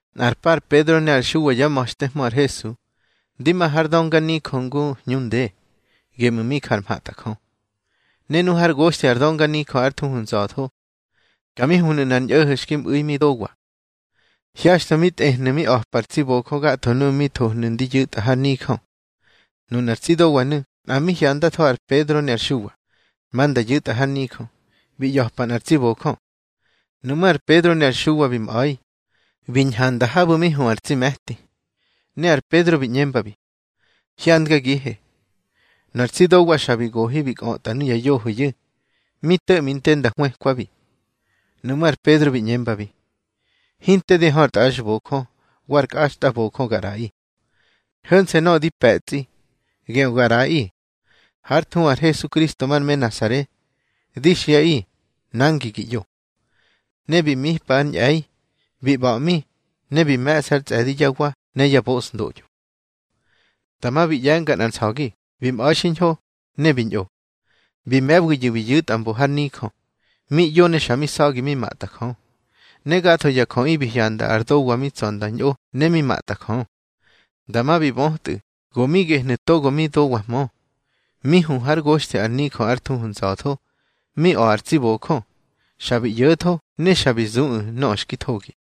Nꞌar pa ar Pedro ne ar Xuwa yá ma̱xtehmö ar Hesu, ndi ma har dönganijö ngu hñu nde, geꞌmu̱ mi jar mhatꞌa Jö. Ne nu hár goxthi ar dönganijö ár thuhu Nza̱tho, ka mi huhnu̱ nꞌar ñꞌo̱ho̱ xki mꞌu̱i mi dowa. Hyaxtho mi tꞌehnu̱ mi a̱pa ar tsi bojö gatho nuꞌu̱ mi thohnu̱ ndi yu̱tꞌa har nijö. Nunar tsi dowanu̱ nꞌa mbi hyandatho ar Pedro ne ar Xuwa, ma nda yu̱tꞌa har nijö, bi ꞌya̱pa nꞌar tsi bojö. Nuꞌmú̱ ar Pedro ne ar Xuwa bi mꞌa̱i, bi ñhanda habu̱ mi hu ar tsi me̱tí, ne ar Pedro bi ꞌñembabi: —Hyandgagihe. Nu ar tsi dowa xa bi gohi mi kꞌötꞌa nuya yohoyu̱, mi to̱ꞌmi te nda hwëkwabi. Nuꞌmú̱ ar Pedro bi ꞌñembabi: —Hinte di hö ar tꞌaxbojö wa ar kꞌaxtbojö ga ꞌraꞌi. Ho̱nse̱ nöꞌö di pe̱tsꞌi, geꞌö ga ꞌraꞌi. Hár thuhu ar Hesukristo mar me Nasare, di xiꞌaꞌi, nangi gi ꞌyo. Ne bi mipa ár ñꞌe̱i, bi ꞌba̱ꞌmi, ne bi me̱ꞌsa ár tsꞌe̱di yá wa ne yá bosndoꞌyo. Dama bi ꞌye̱nga nꞌar nsa̱gi bi mꞌa̱i xiñho, ne bi ñꞌo. Bi me̱wiyu̱ bi yu̱tꞌa mbo ar nijö, mi ꞌyo ne xa mi sa̱gi mi matꞌa Jö. Ne gatho ya jöꞌi bi hyanda ar dowa mi tsa̱ nda ñꞌo ne mi matꞌa Jö. Dama bi bötꞌu̱ go mi gehnu̱ togo mi dowahmö, mi hu hár goxthi ar nijö ár thuhu Nza̱tho, mi a̱ ar tsi bojö. Xa bi ꞌyo̱tho ne xa bi zuꞌu̱ nöꞌö xki thogi.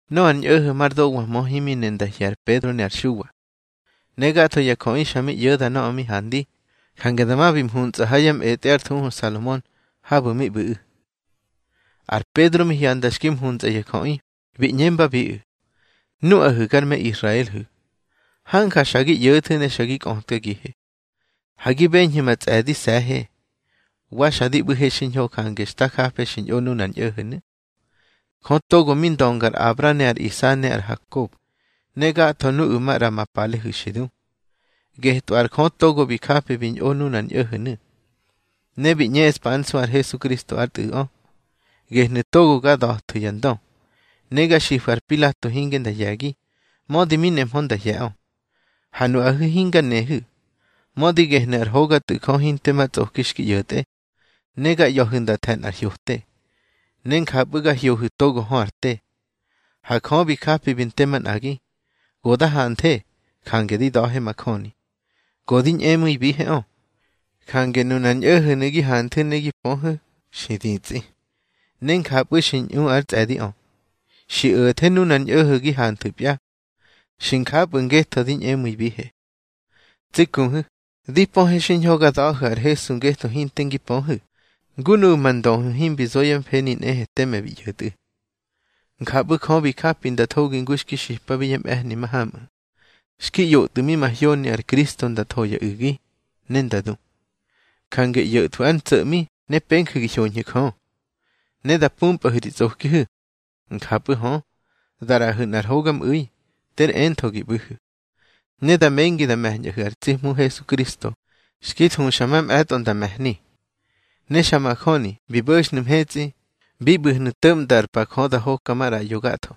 Nöꞌö ar ñꞌo̱ho̱ mar dowahmö himi ne nda hye̱ ar Pedro ne ar Xuwa. Ne gatho ya jöꞌi xa mi ꞌyo̱da nöꞌö mi handi, jange dama bi mhuntsꞌa ha ya mꞌetꞌe ár thuhu ar Salomon, habu̱ mi ꞌbu̱ꞌu̱. Ar Pedro mi hyanda xki mhuntsꞌa ya jöꞌi, bi ꞌñembabiꞌu̱: —Nuꞌahu̱ gar me Israelhu̱, hanja xa gi ꞌyo̱thu̱ ne xa gi kꞌötkagihe. Ha gi beñhu̱ ma tsꞌe̱dise̱he, wa xa di ꞌbu̱he xiñho, jange xta jafe xi ñꞌo nunar ñꞌo̱ho̱nu̱. Jö togo mi ndönga ar Abra ne ar Isa ne ar Hakob, ne gatho nuꞌu̱ maꞌra ma palehu̱ xi du, getꞌö ar Jö togo bi japi bi ñꞌo nunar ñꞌo̱ho̱nu̱, ne bi ꞌñeꞌspa ár nsu ar Hesukristo ár Tꞌu̱ꞌö. Gehnu̱ togo ga da̱thu̱ ya ndö, ne ga xifu̱ ar Pilato hinge nda hye̱gi, mödi mi nemhö nda hye̱ꞌö. Ha nuꞌahu̱ hinga nehu̱, mödi gehnu̱ ár hoga Tꞌu̱ Jö hinte ma tsꞌoki xki ꞌyo̱tꞌe. Ne ga ꞌya̱hu̱ nda the̱ nꞌar hyote. Ne njapꞌu̱ ga hyohu̱ togo hö ar te. Ha Jö bi japi bi nte manꞌagi. Go da hanthe, jange di da̱he majöni. Go di ñꞌemu̱ibiheꞌö, jange nunar ñꞌo̱ho̱nu̱ gi hanthu̱ ne gi pöhu̱, xi ditsꞌi, ne njapꞌu̱ xi ñꞌu ár tsꞌe̱diꞌö. Xi o̱the nunar ñꞌo̱ho̱ gi hanthu̱pya. Xi njapꞌu̱ ngetho di ñꞌemu̱ibihe. Tsi kuhu̱, di pöhe xiñho ga da̱hu̱ ar Hesu ngetho hinte ngi pöhu̱, ngu nuꞌu̱ ma ndöhu̱ himbi zo yá mfeni nꞌehe teme bi ꞌyo̱tꞌu̱. Njapꞌu̱ Jö bi japi nda thogi ngu xki xipabi yá mꞌe̱hni mahamꞌu̱, xki ꞌyotꞌu̱ mi mahyoni ar Kristo nda tho ya u̱gi, ne nda du. Jange ꞌyo̱thwu̱ ár ntso̱ꞌmi ne penju̱ gi hyoñhu̱ Jö, ne da pumpꞌahu̱ ri tsꞌokihu̱. Njapꞌu̱ hö, da ꞌraꞌahu̱ nꞌar hogamꞌu̱i, ter entho gi ꞌbu̱hu̱. Ne da mengi da me̱ñꞌahu̱ ar tsi Hmu Hesukristo xki thuxa mamꞌe̱tꞌo nda me̱hni. Ne xa majöni bi bo̱xnu̱ mhetsꞌi, bi ꞌbu̱hnu̱ to̱ꞌmda ar pa Jö da hoka maꞌraꞌyo gatho,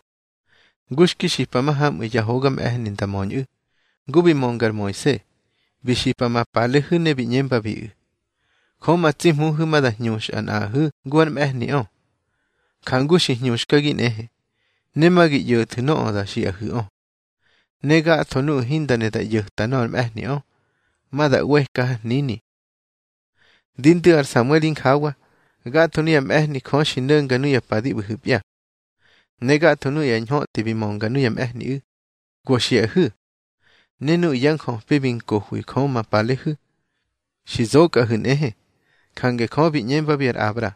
ngu xki xipa mahamꞌu̱ yá hoga mꞌe̱hni nda möñꞌu̱. Ngu bi mönga ar Moise, bi xipa ma palehu̱ ne bi ꞌñembabiꞌu̱: Jö ma tsi Hmuhu̱ ma da hñuxꞌa nꞌaꞌahu̱ ngu ár mꞌe̱hniꞌö, njangu xi hñuxkagi nꞌehe, ne ma gi ꞌyo̱thu̱ nöꞌö da xiꞌahu̱ꞌö. Ne gatho nuꞌu̱ hinda ne da ꞌyo̱ta nöꞌö ar mꞌe̱hniꞌö, ma da ꞌweka har hnini. Di ndu̱ ar Samuel injawa, gatho nuyá mꞌe̱hni Jö xi no̱nga nuya pa di ꞌbu̱hu̱pya. Ne gatho nuꞌu̱ ya ñhötꞌi bi mönga nuya mꞌe̱hniꞌu̱, go xiꞌahu̱. Ne nuꞌu̱ ya njöpi bi nkohwi Jö ma palehu̱, xi zokꞌahu̱ nꞌehe. Jange Jö bi ꞌñembabi ar Abra: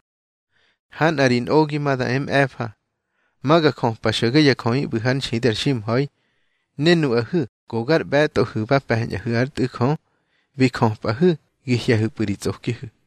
Ha nꞌa ri nꞌogi ma da e mꞌe̱fa, ma ga jöpa xo̱ge ya jöꞌi ꞌbu̱ hár nxidi ar ximha̱i. Ne nuꞌahu̱ go gar ꞌbe̱tꞌohu̱ ba pe̱ñꞌahu̱ ár Tꞌu̱ Jö, bi jöpꞌahu̱ gi hye̱hu̱pꞌu̱ ri tsꞌokihu̱.